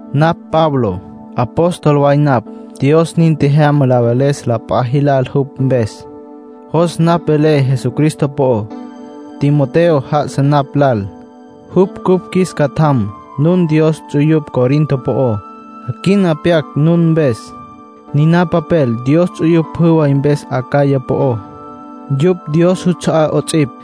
Napj Pablo. Apóstol way napj, Dios nin tjejyama la veles la p'a jilal jupj mpes. Jos napj velé Jesucristo po'ó. Timoteo já'asa napj lal, jupj cupj qjuis catjam. Nun Dios ts'uyupj Corinto po'ó. Quina pyaquecj nun mpes. Niná papel Dios ts'uyupj pjü way mpes Acaya po'ó. Yupj Dios juts'a'á 'ots'ipj.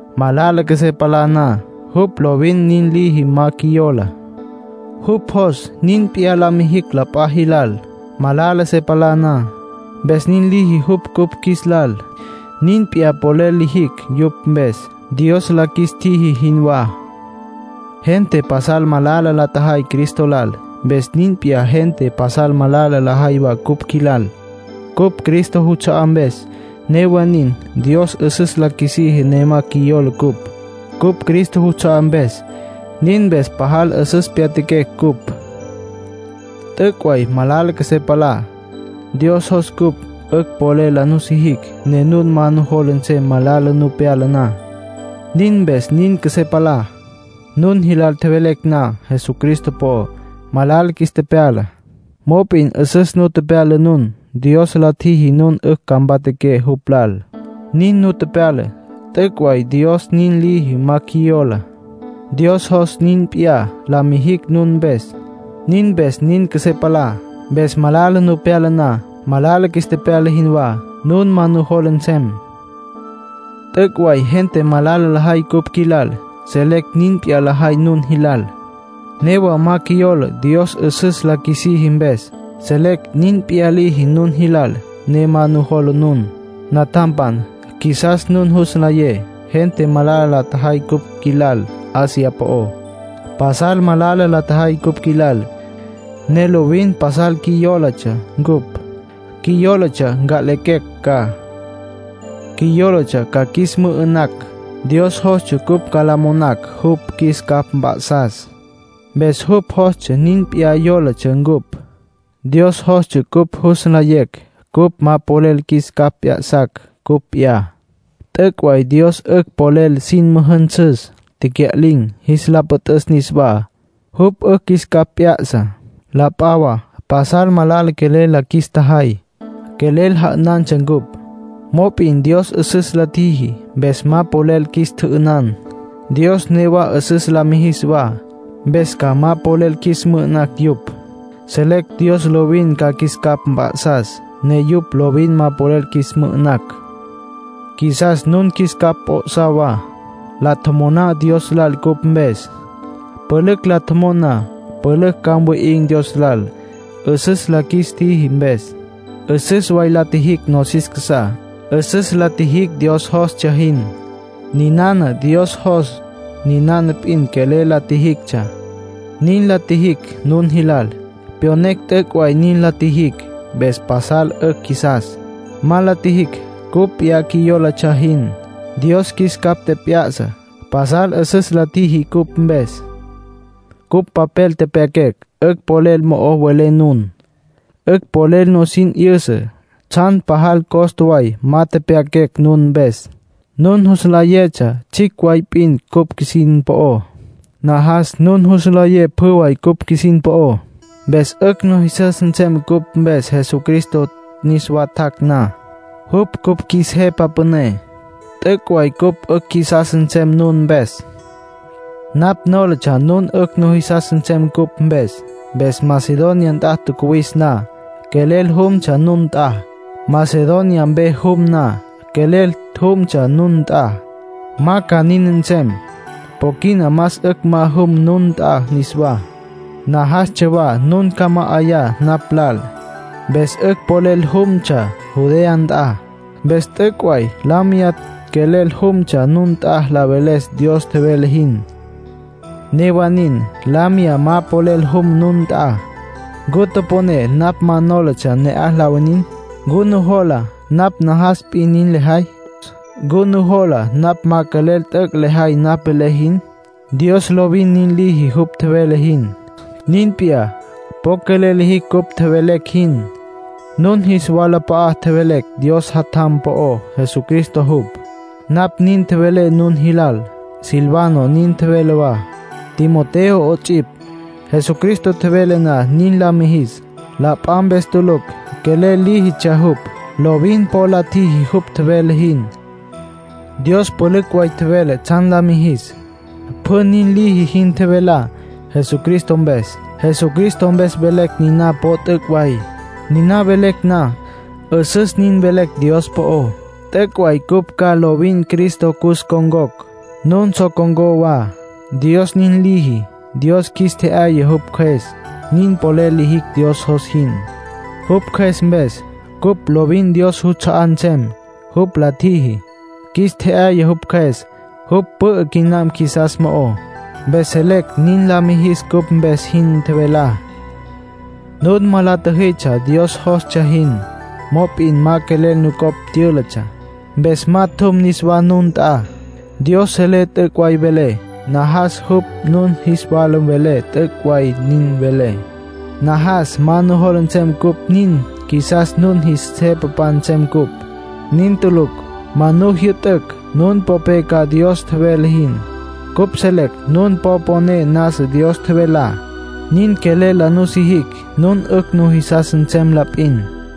Malala qjuesé palá na, jupj lovin nin liji ma qjuiyola. Jupj jos nin p'iyá la mijicj la p'a jilal, malala se palá na, mpes nin liji jupj cupj qjuis lal. Nin p'iyá polel lijicj yupj mpes, Dios la qjuis tjiji jinwá. Gente pasal malala la tjajay Cristo lal. Mpes nin p'iyá gente pasal malala lajay wa cupj qjuilal, cupj Cristo juts'a'á mpes. Newa nin, Dios 'üsüs la qjuisiji ne ma qjuiyola cupj, cupj Cristo juts'a'á mpes. Nin mpes pajal 'üsüs pyatjaquecj cupj. T'üc' way malala qjuesé palá. Dios jos cupj 'ücj polel la nusijicj ne nun ma nujola nsem malala nu pyala na; nin mpes nin qjuesé palá. Nun jilal tjevelecj na Jesucristo po'ó, malala qjuis tepyala. Mop'in 'üsüs nu tepyala nun; Dios la tjiji nun 'ücj ca mpatjaqué jupj lal, nin nu tepyala. T'üc' way Dios nin liji ma qjuiyola. Dios jos nin p'iyá la mijicj nun mpes; nin mpes nin qjuesé palá. Mpes malala nu pyala na, malala qjuis tepyala jinwá, nun ma nujola nsem. T'üc' way gente malala lajay cupj qjuilal. Selecj nin p'iyá lajay nun jilal. Newa ma qjuiyola Dios 'üsüs la qjuisiji mpes. Selecj nin p'iyá liji nun jilal, ne ma nujola nun. Natjampan, qjuisas nun jus nlayé gente malala la tjajay cupj qjuilal Asia po'ó. Pasal malala la tjajay cupj qjuilal, ne lovin pasal qjuiyólatsja ncupj. Qjuiyólatsja nca'lequecj ca. Qjuiyólatsja ca qjuis mü'ü'nacj. Dios jostsja cupj ca la monacj jupj qjuis capj mp'a'sas, mpes jupj jostsja nin qjuiyólatsja cupj. Dios jostsja cupj jus nlayecj cupj ma polel qjuis capj p'ya'sacj cupj p'iyá. T'üc' way Dios 'ücj polel sin müjünsüs tecya'lin̈, jis la püt'üs niswá. Jupj 'ücj qjuis capj p'ya'sa. La p'a wa pasal malala quelel la qjuis tjajay. Quelel ja'ünantsja cupj. Mop'in Dios 'üsüs la tjiji, mpes ma polel qjuis tjü'ünan. Dios newa 'üsüs la mijis wa, mpes ca ma polel qjuis mü'ü'nacj yupj. Selecj Dios lovin ca qjuis capj mp'a'sas ne yupj lovin ma polel qjuis mü'ü'nacj. Qjuisas nun qjuis capj p'o'sá wa. La tjomoná Dios lal cupj mpes. Pülücj la tjomon na, pülücj ca mwi'in̈ Dios lal, 'üsüs la qjuis tjiji mpes. 'Üsüs way la tjijicj nosis casá. 'Üsüs la tjijicj Dios jostsja jin. Ninana Dios jos, ninana p'in quelel la tjijictsja. Nin la tjijicj nun jilal. Pyonecj t'üc' way nin la tjijicj. Mpes pasal 'ücj qjuisas. Ma la tjijicj cupj p'iyá qjuiyólatsja jin. Dios qjuis capj tjep'ya'sa. Pasal 'üsüs la tjiji cupj mpes. Cupj papel tepyaquecj, 'ücj polel mo'o welé nun. 'Ücj polel nusin 'yüsa. Tsjan pajal costa way ma tepyaquecj nun mpes. Nun jus nlayetsja tsjicj way p'in cupj qjuisin po'ó. Najas nun jus nlayé pjü way cupj qjuisin po'ó. Mpes 'ücj nujisas nsem cupj mpes Jesucristo niswa tjac' na, jupj cupj qjuis Jepa Püné. T'üc' way cupj 'ücj qjuisas nsem nun mpes. Napj nólatsja nun 'ücj nujisas nsem cupj mpes. Mpes Macedonia nt'a tjacuwis na, quelel jumtsja nun nt'a. Macedonia mpe jum na, quelel jumtsja nun nt'a. Ma ca nin nsem. Po quina más 'ücj ma jum nun nt'a niswá. Najastsja wa nun ca ma 'ayá napj lal, mpes 'ücj polel jumtsja Judea nt'a. Mpes t'üc' way la miyá quelel jumtsja nun nt'a la veles Dios tjevele jin. Newa nin, la miyá ma polel jum nun nt'a. ¿Ncu toponé napj ma nólatsja ne'aj la winin? ¿Ncu nujola napj najas p'in nin lejay? ¿Ncu nujola napj ma quelel t'üc' lejay napj velé jin? Dios lovin nin liji jupj tjevele jin. Nin p'iyá, po quelel lijicj cupj tjevelecj jin. Nun jis walap'a'a tjevelecj Dios Jatjam po'ó, Jesucristo jupj. Napj nin tjevelé nun jilal. Silvano nin tjevele wa. Timoteo 'ots'ipj. Jesucristo tjevele na nin la mijis, la p'a mpes tulucj quelel líjitsja jupj. Lovin po la tjiji jupj tjevele jin. Dios pülücj way tjevele tsjan la mijis. Pjü nin liji jin tjevelá, Jesucristo mpes. Jesucristo mpes velecj niná po t'üc' way. Niná velecj na, 'üsüs nin velecj Dios po'ó. T'üc' way cupj ca lovin Cristo cus ncon̈cocj, nun so con̈có wa. Dios nin liji. Dios qjuis tje'yaya jupj Cjües, nin polel lijicj Dios jos jin, jupj Cjües mpes. Cupj lovin Dios juts'a'á nsem, jupj la tjiji. Qjuis tje'yaya jupj Cjües, jupj pü'ü quinam qjuisas mo'ó. Mpes selecj nin la mijis cupj mpes jin tjevelá. Nun ma la tjüjitsja Dios jostsja jin. Mop'in ma quelel nucopj tyültsja. Mpes ma tjum niswá nun nt'a. Dios selé t'üc' way velé, najas jupj nun jis wala vele t'üc' way nin velé. Najas ma nujola nsem cupj nin qjuisas nun jis jepapan nsem cupj. Nin tulucj. Ma nu jyü'tücj nun mponé ca Dios tjevele jin. Cupj selecj nun po poné nasa Dios tjevelá. Nin quelel la nusijicj nun 'ücj nujisas nsem la p'in.